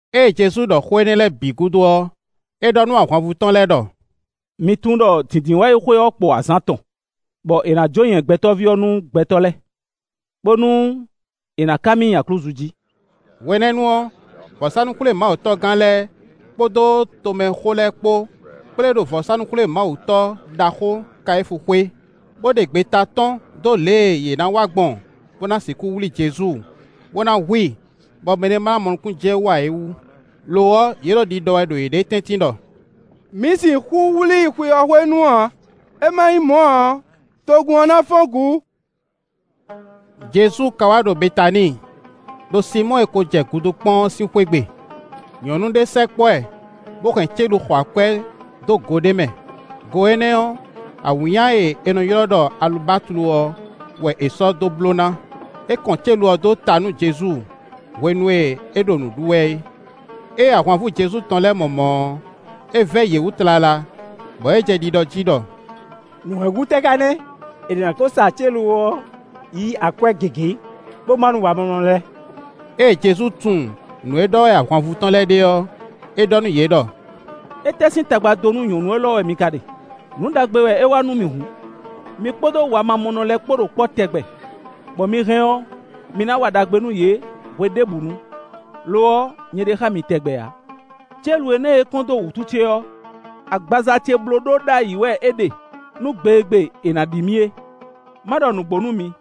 Ée Jezu ɖɔ xó énɛ́ lɛ́ɛ bǐ gúdo ɔ́, é ɖɔ nú ahwanvú tɔn lɛ́ɛ ɖɔ: “Mi tunwun ɖɔ Dǐndínwáyi sín xwe ɔ́ kpo azǎn atɔn, bɔ è nǎ jó nyɛ Gbɛtɔ́ví ɔ́ nú gbɛtɔ́ lɛ́ɛ, bónú è nǎ ká mì nyi aklúzu jí.” Hwenɛ́nu ɔ́, vɔ̌sánú-xwlémawutɔ́gán lɛ́ɛ kpódó tomɛxó lɛ́ɛ kpó kplé ɖo vɔ̌sánú-xwlémawutɔ́ ɖaxó Kayífu xwé, bó ɖe gbeta tɔ́n dó lě e yě ná wa gbɔn bó ná sixú wlí Jezu, bó ná hu i, bɔ mɛɖé ma ná mɔ nukúnnú jɛ wú ǎ é wú. Lo ɔ́, yě ɖo ɖiɖɔ wɛ ɖo yěɖée tɛ́ntin ɖɔ: “Mǐ sixú wlí i xwe ɔ́ hwenu ǎ; é ma nyí mɔ̌ ǎ ɔ́, togun ɔ́ ná fɔ́n gǔ.” Jezu ka wá ɖo Betaníi, ɖo Sinmɔ́ɔ e ko jɛ gudu kpɔ́n ɔ́ sín xwé gbe. Nyɔ̌nu ɖé sɛkpɔ́ ɛ, bó hɛn célu xɔ akwɛ́ dó go ɖé mɛ; go énɛ́ ɔ́, awǐnnya e è nɔ ylɔ́ ɖɔ alubatlu ɔ́ wɛ è sɔ́ dó bló ná. É kɔn célu ɔ́ dó ta nú Jezu hwenu e é ɖo nǔ ɖu wɛ é. Ée ahwanvú Jezu tɔn lɛ́ɛ mɔ mɔ̌ ɔ́, é vɛ́ yě wú tlala, bɔ yě jɛ ɖiɖɔ jí ɖɔ: “Nǔ hɛn gú tɛ́ ka nɛ́? È nǎ kó sa célu ɔ́ yí akwɛ́ gěgé, bó má nú wamamɔnɔ lɛ́ɛ.” Ée Jezu tunwun nǔ e ɖɔ wɛ ahwanvú tɔn lɛ́ɛ ɖe ɔ́, é ɖɔ nú yě ɖɔ: “Étɛ́ sín tagba dó nú nyɔ̌nu élɔ́ wɛ mi ka ɖe? Nǔ ɖagbe wɛ é wa nú mì hǔn. Mi kpódó wamamɔnɔ lɛ́ɛ kpó ɖo kpɔ́ tɛgbɛ, bɔ mi hɛn ɔ́, mi ná wa ɖagbe nú yě hweɖěbǔnu. Lo ɔ́, nyɛ ɖe xá mi tɛgbɛ ǎ. Célu énɛ́ e é kɔn dó wǔtu ce ɔ́, agbaza ce blóɖó ɖó ayǐ wɛ é ɖe, nú gbe e gbe è nǎ ɖi mì é. Má ɖɔ nǔgbó nú mi: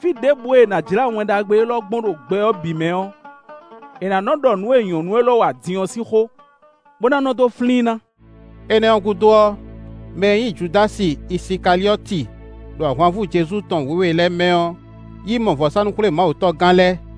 fí ɖěbǔ e è nǎ jlá Wɛn Ɖagbe élɔ́ gbɔn ɖo gbɛ ɔ́ bǐ mɛ ɔ́, è nǎ nɔ́ ɖɔ nǔ e nyɔ̌nu élɔ́ wa din ɔ́ sín xó, bó ná nɔ́ dó flín i ná.” Énɛ́ ɔ́ gúdo ɔ́, mɛ e nyí Judási Isikaliɔ́ti ɖo ahwanvú Jezu tɔn wěwe lɛ́ɛ mɛ ɔ́ yi mɔ vɔ̌sánú-xwlémawutɔ́gán lɛ́ɛ,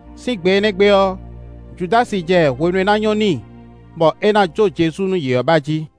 Sín gbe énɛ́ gbe ɔ́, Judási jɛ hwenu e ná nyɔ́ n'i, bɔ é ná jó Jezu nú yě ɔ́ ba jí.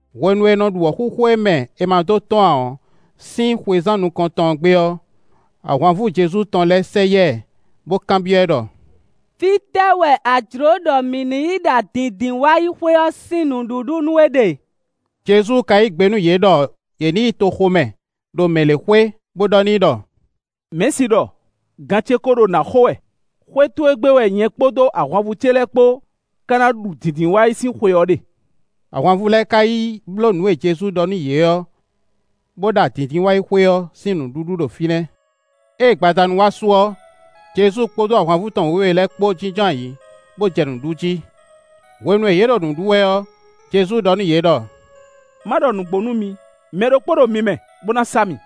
Hwenu è nɔ ɖu wɔ̌xúxú e mɛ è ma dó tɔ́n ǎ ɔ́ sín xwezán nukɔntɔn ɔ́ gbe ɔ́, ahwanvú Jezu tɔn lɛ́ɛ sɛ yá ɛ, bó kanbyɔ́ ɛ ɖɔ: “Fítɛ́ wɛ a jlǒ ɖɔ mǐ ní yi ɖa Dǐndínwáyixwe ɔ́ sín nǔɖuɖu nú we ɖe?” Jezu ka yí gbe nú yě ɖɔ yě ní yi toxo mɛ, ɖo mɛ lě xwé, bó ɖɔ n'i ɖɔ: “Mɛ̌si ɖɔ: ‘Gan ce kó ɖo nǎ xo wɛ; xwé towe gbe wɛ nyɛ kpódó ahwanvú ce lɛ́ɛ kpó ká ná ɖu Dǐndínwáyi sín xwe ɔ́ ɖe.’” Ahwanvú lɛ́ɛ ká yi bló nǔ e Jezu ɖɔ nú yě ɔ́, bó ɖa Dǐndínwáyixwe ɔ́ sín nǔɖuɖu ɖo fínɛ́. Ée gbadanu wá su ɔ́, Jezu kpódó ahwanvú tɔn wěwe lɛ́ɛ kpó jínjɔ́n ayǐ, bó jɛ nǔ ɖu jí. Hwenu e yě ɖo nǔ ɖu wɛ ɔ́, Jezu ɖɔ nú yě ɖɔ: “Má ɖɔ nǔgbó nú mi, mɛ ɖokpó ɖo mi mɛ, bo ná sa mì.”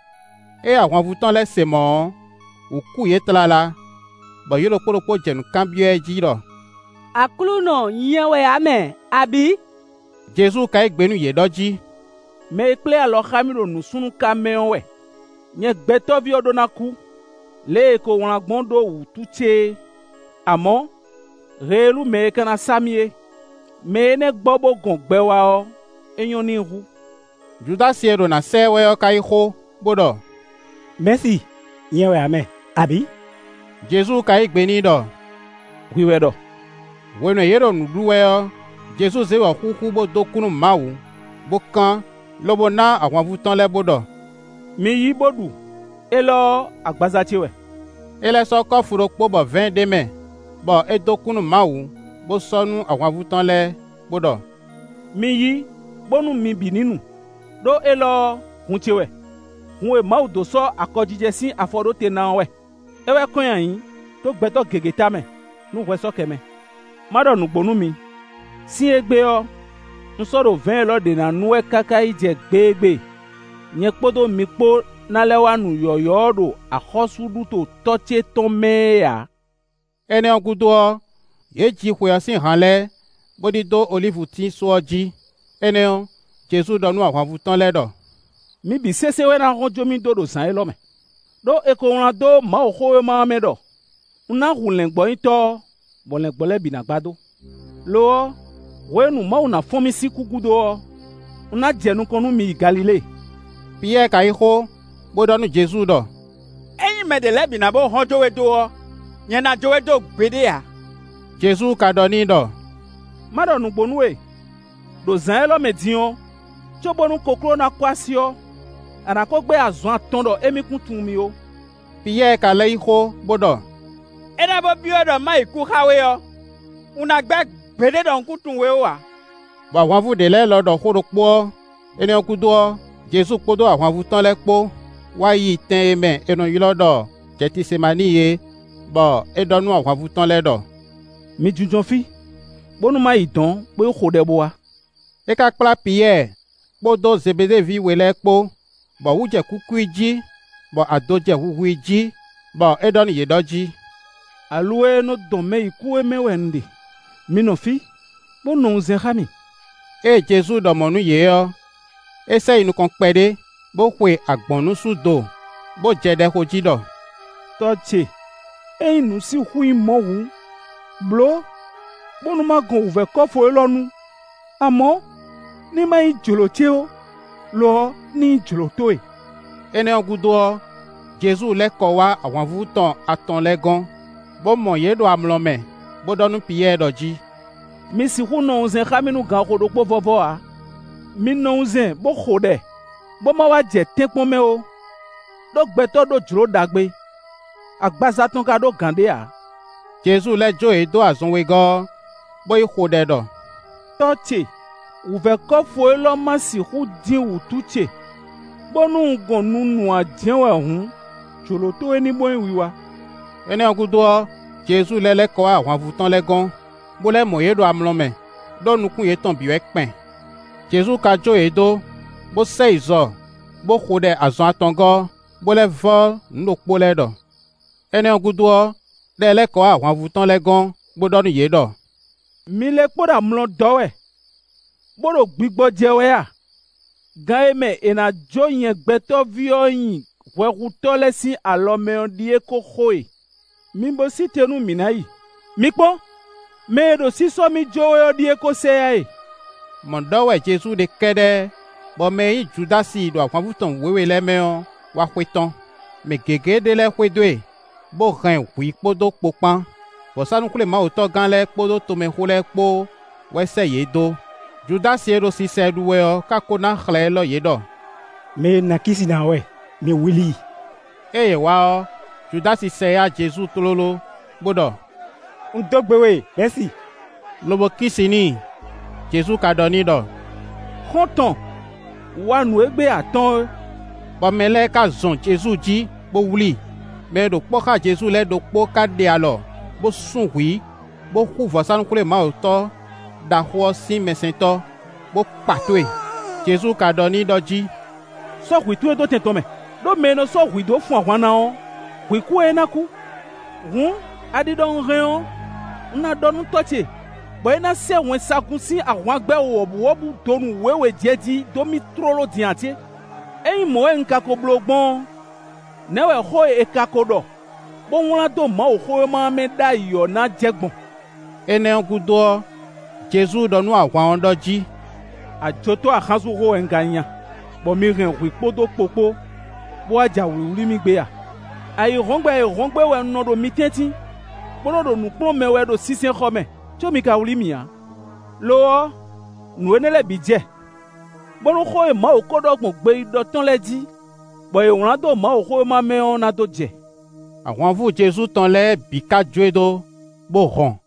Ée ahwanvú tɔn lɛ́ɛ se mɔ̌ ɔ́, wǔ kú yě tlala. Bɔ yě ɖokpó ɖokpó jɛ nǔ kanbyɔ́ ɛ jí ɖɔ: “Aklúnɔ nyɛ wɛ ǎ mɛ! Abǐ?” Jezu ka yí gbe nú yě ɖɔ jí: “Mɛ e kplé alɔ xá mì ɖo nǔsúnnúká mɛ ɔ́ wɛ. Nyɛ Gbɛtɔ́ví ɔ́ ɖó ná kú, lě e è ko wlán gbɔn ɖó wǔtu ce é; amɔ̌, heelú mɛ e ka ná sa mì é; mɛ énɛ́ gbɔ bó gɔn gbɛ wá ɔ́, é nyɔ́ n'i hú.” Judási e ɖo na sá ɛ wɛ ɔ́ ka yí xó, bo ɖɔ: “Mɛ̌si! Nyɛ wɛ ǎ mɛ! Abǐ?” Jezu ka yí gbe n'i ɖɔ: “Hwi wɛ ɖɔ.” Hwenu e yě ɖo nǔ ɖu wɛ ɔ́, Jezu zé wɔ̌xúxú bó dó kú nú Mawu, bó kán, lobo ná ahwanvú tɔn lɛ́ɛ bó ɖɔ: “Mi yí, bó ɖu, élɔ́ ɔ́, agbaza ce wɛ.” É lɛ́ sɔ́ kɔ́fu ɖokpó bɔ vɛ̌ɛn ɖ'é mɛ, bɔ é dó kú nú Mawu, bó sɔ́ nú ahwanvú tɔn lɛ́ɛ, bo ɖɔ: “Mi yí, bónú mi bǐ ní nu. Ɖó élɔ́ ɔ́, hun ce wɛ; hun e Mawu dó sɔ́ akɔjijɛ sín afɔ ɖó te ná ɔ́ wɛ. É wɛ kɔn nyi ayǐ, dó gbɛtɔ́ gěgé tamɛ, nú hwɛ sɔ́ kɛ mɛ. Má ɖɔ nǔgbó nú mi: sín égbé ɔ́, un sɔ́ ɖo vɛ̌ɛn élɔ́ ɖě ná nu wɛ káká yi jɛ gbe e gbe nyɛ kpódó mi kpó ná lɛ́ wá nu yɔ̌yɔ́ ɔ́ ɖo axɔ́súɖuto Tɔ́ ce tɔn mɛ é ǎ.” Énɛ́ ɔ́ gúdo ɔ́, yě ji xwe ɔ́ sín han lɛ́ɛ, bó ɖidó olívutín só ɔ́ jí. Énɛ́ ɔ́, Jezu ɖɔ nú ahwanvú tɔn lɛ́ɛ ɖɔ: “Mi bǐ sésé wɛ ná hɔn jó mì dó ɖo zǎn élɔ́ mɛ. Ɖó è ko wlán dó Mawuxówéma ɔ́ mɛ ɖɔ: ‘Un ná hu lɛ̌ngbɔ́nyitɔ́ ɔ́, bɔ lɛ̌ngbɔ́ lɛ́ɛ bǐ ná gbadó.’ Lo ɔ́, hwenu e Mawu ná fɔ́n mì sín kú gúdo ɔ́, un ná jɛ nukɔn nú mi yi Galilée.” Piyɛ́ɛ ka yí xó, bó ɖɔ nú Jezu ɖɔ: “Ényí mɛ ɖě lɛ́ɛ bǐ ná bó hɔn jó we dó ɔ́, nyɛ ná jó we dó gbeɖé ǎ.” Jezu ka ɖɔ n'i ɖɔ: “Má ɖɔ nǔgbó nú we; ɖo zǎn élɔ́ mɛ din ɔ́, cóbónú kokló ná kɔ́ así ɔ́, a nǎ kó gbɛ́ azɔn atɔn ɖɔ émí kún tunwun mì ó.” Piyɛ́ɛ ka lɛ́ yí xó, bó ɖɔ: “É ná bó byɔ́ ɖɔ ma yi kú xá we ɔ́, un ná gbɛ́ gbeɖé ɖɔ un kún tunwun we ó ǎ.” Bɔ ahwanvú ɖě lɛ́ɛ lɔ ɖɔ xó ɖokpó ɔ́. Énɛ́ ɔ́ gúdo ɔ́, Jezu kpódó ahwanvú tɔn lɛ́ɛ kpó wá yi tɛn e mɛ è nɔ ylɔ́ ɖɔ Jɛtisemaníi é, bɔ é ɖɔ nú ahwanvú tɔn lɛ́ɛ ɖɔ: “Mi jínjɔ́n fí, bónú ma yi dɔ̌n bó yi xo ɖɛ bo wá.” É ka kplá Piyɛ́ɛ kpódó Zebeɖée ví we lɛ́ɛ kpó, bɔ wǔ jɛ kúkú i jí, bɔ ado jɛ huhu i jí; bɔ é ɖɔ nú yě ɖɔ jí: “Aluwɛ e nɔ dɔn mɛ yi kú é mɛ wɛ un ɖe; mi nɔ fí, bó nɔ wunzɛn xá mì.” Ée Jezu ɖɔ mɔ̌ nú yě ɔ́, é sɛ yi nukɔn kpɛɖé, bo xwe agbɔ̌nnusú do, bó jɛ ɖɛ xo jí ɖɔ: “Tɔ́ ce, ényí nǔ sixú nyí mɔ̌ hǔn, blǒ bónú ma gɔn wǔvɛ́ kɔ́fu élɔ́ nu. Amɔ̌, ní ma nyí jlǒ ce ó, lo ɔ́, ní nyí jlǒ towe.” Énɛ́ ɔ́ gúdo ɔ́, Jezu lɛ́ kɔ wá ahwanvú tɔn atɔn lɛ́ɛ gɔ́n, bo mɔ yě ɖo amlɔ mɛ, bo ɖɔ nú Piyɛ́ɛ ɖɔ jí: “Mi sixú nɔ wunzɛn xá mì nú ganxixo ɖokpó vɔ́vɔ́ ǎ? Mi nɔ wunzɛn bó xo ɖɛ, bó ma wá jɛ tɛ́nkpɔ́n mɛ ó; ɖó gbɛtɔ́ ɖó jlǒ ɖagbe, agbaza tɔn ka ɖó gǎn ɖé ǎ.” Jezu lɛ́ jó yě dó azɔn wegɔ́ ɔ́, bó yi xo ɖɛ ɖɔ: “Tɔ́ ce, wǔvɛ́ kɔ́fu élɔ́ ma sixú dín wǔtu ce, bónú un gɔn nunu ǎ jɛ́n wɛ hǔn, jlǒ towe ní bó nyí wiwa.” Énɛ́ ɔ́ gúdo ɔ́, Jezu lɛ́ lɛ́ kɔ wá ahwanvú tɔn lɛ́ɛ gɔ́n, bó lɛ́ mɔ yě ɖo amlɔ mɛ, ɖó nukún yětɔn bǐ wɛ kpɛn. Jezu ka jó yě dó, bó sɛ yi zɔ bó xo ɖɛ azɔn atɔngɔ́ ɔ́, bó lɛ́ vɔ́ nǔ ɖokpó lɛ́ɛ ɖɔ. Énɛ́ ɔ́ gúdo ɔ́, é lɛ́ lɛ́ kɔ wá ahwanvú tɔn lɛ́ɛ gɔn, bó ɖɔ nú yě ɖɔ: “Mi lɛ́ kpo ɖo amlɔ dɔ́ wɛ, bó ɖo gbigbɔ jɛ wɛ a? Gan e mɛ è nǎ jó nyɛ Gbɛtɔ́ví ɔ́ nyi hwɛhutɔ́ lɛ́ɛ sín alɔ mɛ ɔ́ ɖíe kó xo e. Mi bo sí te nú mǐ ná yi. Mi kpɔ́n! Mɛ e ɖo sísɔ́ mì jó wɛ ɔ́ ɖíe kó sɛ yá e.” Mɔ̌ ɖɔ wɛ Jezu ɖe kɛ́ɖɛ́ bɔ mɛ e nyí Judási ɖo ahwanvú tɔn wěwe lɛ́ɛ mɛ ɔ́ wá xwetɔ́n; mɛ gěgé ɖé lɛ́ɛ xwedó e, bó hɛn hwǐ kpódó kpo kpán. Vɔ̌sánú-xwlémawutɔ́gán lɛ́ɛ kpódó tomɛxó lɛ́ɛ kpó wɛ sɛ́ yě dó. Judási e ɖo sisa ɛ ɖu wɛ ɔ́ ka ko ná xlɛ̌ élɔ́ yě ɖɔ: “Mɛ e un ná kí si ná ɔ́ wɛ, mi wlí i.” Ée yě wá ɔ́, Judási sɛ yá Jezu tlóló, bó ɖɔ: “Un dó gbe we Mɛ̌si!” Lobo kí si n'i. Jezu ka ɖɔ n'i ɖɔ: “Xɔ́ntɔn, wa nǔ e gbé a tɔ́n ɔ́;” bɔ mɛ lɛ́ɛ ka zɔn Jezu jí, bó wlí i. Mɛ e ɖo kpɔ́ xá Jezu lɛ́ɛ ɖokpó ka ɖe alɔ, bó sún hwǐ, bó xú vɔ̌sánú-xwlémawutɔ́ ɖaxó ɔ́ sín mɛsɛntɔ́, bó kpa tó e. Jezu ka ɖɔ n'i ɖɔ jí: “Sɔ́ hwǐ towe ɖó tɛn tɔn mɛ. Ɖó mɛ e nɔ sɔ́ hwǐ dó fun ahwan ná ɔ́, hwǐ kú wɛ é ná kú. Hǔn, a ɖi ɖɔ un hɛn ɔ́, un ná ɖɔ nú Tɔ́ ce, bɔ é ná sɛ́ wɛnsagun sín ahwangbɛ́ wɔ̌buwɔ́bú donu wěwe jɛjí dó mì tlóló din ǎ cé? Ényí mɔ̌ wɛ un ka ko bló gbɔn ɔ́, nɛ̌ wɛ xó e è ka ko ɖɔ, bó wlán dó Mawuxówéma ɔ́ mɛ ɖ'ayǐ ɔ́ ná jɛ gbɔn?” Énɛ́ ɔ́ gúdo ɔ́, Jezu ɖɔ nú ahwan ɔ́ ɖɔ jí: “Ajotɔ́ axánsúnxó wɛ un ka nyí, bɔ mi hɛn hwǐ kpódó kpo kpó, bó wá ja wlǐwlí mì gbé a? Ayǐhɔ́ngbe ayǐhɔ́ngbe wɛ un nɔ ɖo mi tɛ́ntin, bó nɔ ɖo nǔ kplɔ́n mɛ wɛ ɖo sinsɛnxɔ mɛ, có mi ka wlí mì ǎ. Lo ɔ́, nǔ énɛ́ lɛ́ɛ bǐ jɛ, bónú xó e Mawu ko ɖɔ gbɔn gbeyíɖɔ tɔn lɛ́ɛ jí, bɔ è wlǎn dó Mawuxówéma mɛ ɔ́ ná dó jɛ.” Ahwanvú Jezu tɔn lɛ́ɛ bǐ ka jó e dó, bó hɔn.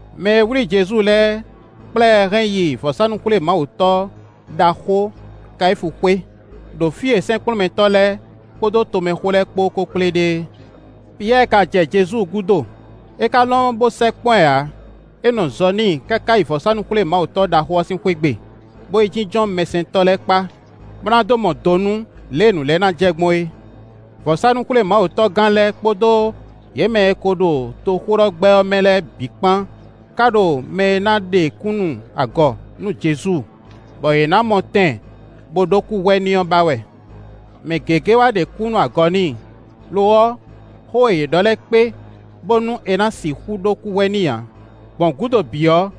Mɛ e wlí Jezu lɛ́ɛ kplá ɛ hɛn yi vɔ̌sánú-xwlémawutɔ́ ɖaxó Kayífu xwé, ɖo fí e sɛ́nkplɔ́nmɛtɔ́ lɛ́ɛ kpódó tomɛxó lɛ́ɛ kpó ko kplé ɖe é. Piyɛ́ɛ ka jɛ Jezu gúdo, é ka lɔn bó sɛkpɔ́ ɛ ǎ; é nɔ zɔ n'i káká yi vɔ̌sánú-xwlémawutɔ́ ɖaxó ɔ́ sín xwé gbe, bó yi jínjɔ́n mɛsɛntɔ́ lɛ́ɛ kpá, bó ná dó mɔ do nú lě e nǔ lɛ́ɛ ná jɛ gbɔn é. Vɔ̌sánú-xwlémawutɔ́gán lɛ́ɛ kpódó yě mɛ e ko ɖo toxóɖɔgbɛ́ ɔ́ mɛ lɛ́ɛ bǐ kpán ka ɖo mɛ e ná ɖe kúnnu agɔ nú Jezu, bɔ yě ná mɔ tɛn bó ɖó kúhwɛ n'i ɔ́ ba wɛ. Mɛ gěgé wá ɖe kúnnu agɔ n'i; lo ɔ́, xó e yě ɖɔ lɛ́ɛ kpé, bónú è nǎ sixú ɖó kúhwɛ n'i ǎ. Gbɔn gǔdo bǐ ɔ́,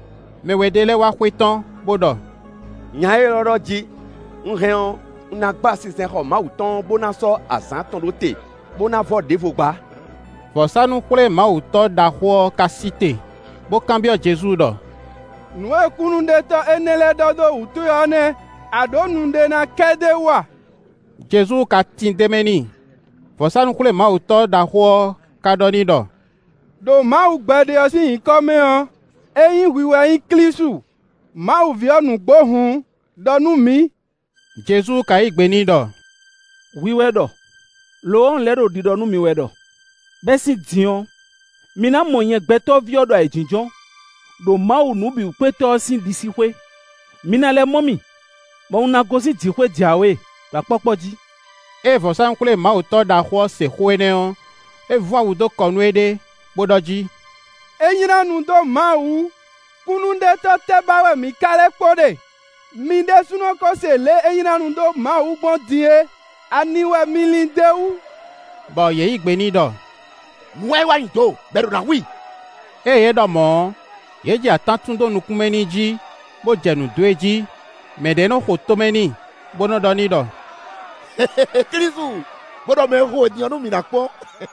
mɛ we ɖé lɛ́ɛ wá xwetɔ́n, bó ɖɔ: “Nya élɔ́ ɖɔ jí: ‘Un hɛn ɔ́, un ná gba sinsɛnxɔ Mawu tɔn ɔ́, bó ná sɔ́ azǎn atɔn ɖó te, bó ná vɔ́ ɖěvo gbá.’” Vɔ̌sánú-xwlémawutɔ́ ɖaxó ɔ́ ka sí te, bó kanbyɔ́ Jezu ɖɔ: “Nǔ e kúnnuɖetɔ́ énɛ́ lɛ́ɛ ɖɔ dó wǔ towe ɔ́ nɛ́, a ɖǒ nu ɖé ná kɛ d'é wú a?” Jezu ka tin d'é mɛ n'i. Vɔ̌sánú-xwlémawutɔ́ ɖaxó ɔ́ ka ɖɔ n'i ɖɔ: “Ɖo Mawu gbɛɖe ɔ́ sín nyǐkɔ mɛ ɔ́, ényí hwi wɛ nyí Klísu, Mawu ví ɔ́ nǔgbó hǔn, ɖɔ nú mǐ.” Jezu ka yí gbe n'i ɖɔ: “Hwi wɛ ɖɔ, lo ɔ́, un lɛ́ ɖo ɖiɖɔ nú mi wɛ ɖɔ: bɛ́ sín din ɔ́, mi ná mɔ nyɛ Gbɛtɔ́ví ɔ́ ɖo ayǐjínjɔ́n, ɖo Mawu Nǔbǐwúkpétɔ́ ɔ́ sín ɖisíxwé; mi ná lɛ́ mɔ mì, bɔ un ná gosín jǐxwé jǎwe, ɖo akpɔ́kpɔ́ jí.” Ée vɔ̌sánú-xwlémawutɔ́ ɖaxó ɔ́ se xó énɛ́ ɔ́, é vún awu dó kɔ nú éɖée, bó ɖɔ jí: “É nylá nu dó Mawu wú! Kúnnuɖetɔ́ tɛ́ ba wɛ mǐ ka lɛ́ kpo ɖe? Mi ɖésúnɔ kó se lě e é nylá nu dó Mawu wú gbɔn din é. Ani wɛ mi lin d'é wú?” Bɔ yě yí gbe n'i ɖɔ: “Nǔ wɛ é wa nyi do bɔ è ɖǒ ná hu i!” Ée yě ɖɔ mɔ̌ ɔ́, yě jɛ atán tún dó nukún mɛ n'i jí, bó jɛ nǔ dó e jí. Mɛ ɖě nɔ xo tomɛ n'i, bó nɔ ɖɔ n'i ɖɔ: “Klísu, bo ɖɔ mɛ e xo we din ɔ́ nú mǐ nǎ kpɔ́n.”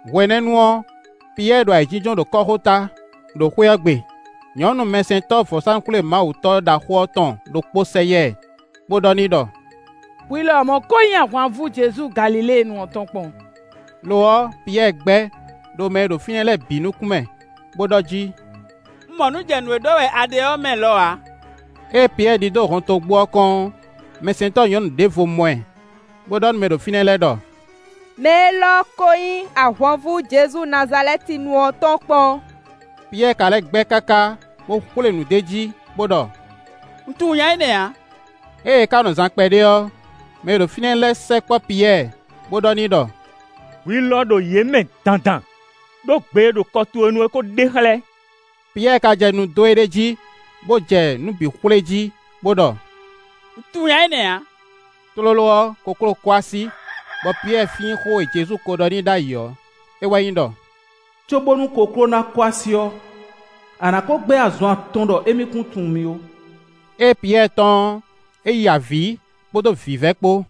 Hwenɛ́nu ɔ́, Piyɛ́ɛ ɖo ayǐjínjɔ́n ɖo kɔ́xota, ɖo xwé ɔ́ gbe. Nyɔ̌nu mɛsɛntɔ́ vɔ̌sánú-xwlémawutɔ́ ɖaxó ɔ́ tɔn ɖokpó sɛ yá ɛ, bó ɖɔ n'i ɖɔ: “Hwi lɔmɔ̌ ko nyí ahwanvú Jezu Galiléenu ɔ́ tɔn kpɔ́n.” Lo ɔ́, Piyɛ́ɛ gbɛ́, ɖo mɛ e ɖo fínɛ́ lɛ́ɛ bǐ nukún mɛ, bo ɖɔ jí: “Un mɔ nǔ jɛ nǔ e ɖɔ wɛ a ɖe ɔ́ mɛ lɔ ǎ.” Ée Piyɛ́ɛ ɖidó hɔntogbó ɔ́ kɔn ɔ́, mɛsɛntɔ́ nyɔ̌nu ɖěvo mɔ ɛ, bó ɖɔ nú mɛ e ɖo fínɛ́ lɛ́ɛ ɖɔ: “Mɛ élɔ́ ko nyí ahwanvú Jezu Nazalɛ́tinu ɔ́ tɔn kpɔ́n.” Piyɛ́ɛ ka lɛ́ gbɛ́ káká, bó xwlé nǔ d'é jí, bo ɖɔ: “Un tunwun nya énɛ́ ǎ.” Ée é ka nɔ zaan kpɛɖé ɔ́, mɛ e ɖo fínɛ́ lɛ́ɛ sɛkpɔ́ Piyɛ́ɛ, bo ɖɔ n'i ɖɔ: “Hwi lɔ ɖo yě mɛ dandan, ɖó gbe e ɖo kɔ towe nu ɔ́ ko ɖe xlɛ́.” Piyɛ́ɛ ka jɛ nu dó éɖée jí, bo jɛ nǔ bǐ xwlé jí, bo ɖɔ: “Un tunwun nya énɛ́ ǎ.” Tlóló ɔ́, kokló kɔ así, bɔ Piyɛ́ɛ flín xó e Jezu ko ɖɔ n'i ɖ'ayǐ ɔ́, é wɛ nyí ɖɔ: “Cóbónú kokló ná kɔ́ así ɔ́, a nǎ ko gbɛ́ azɔn atɔn ɖɔ émí kún tunwun mì ó.” Ée Piyɛ́ɛ tɔ́n ɔ́, é ya avǐ, kpódó vǐvɛ́ kpó.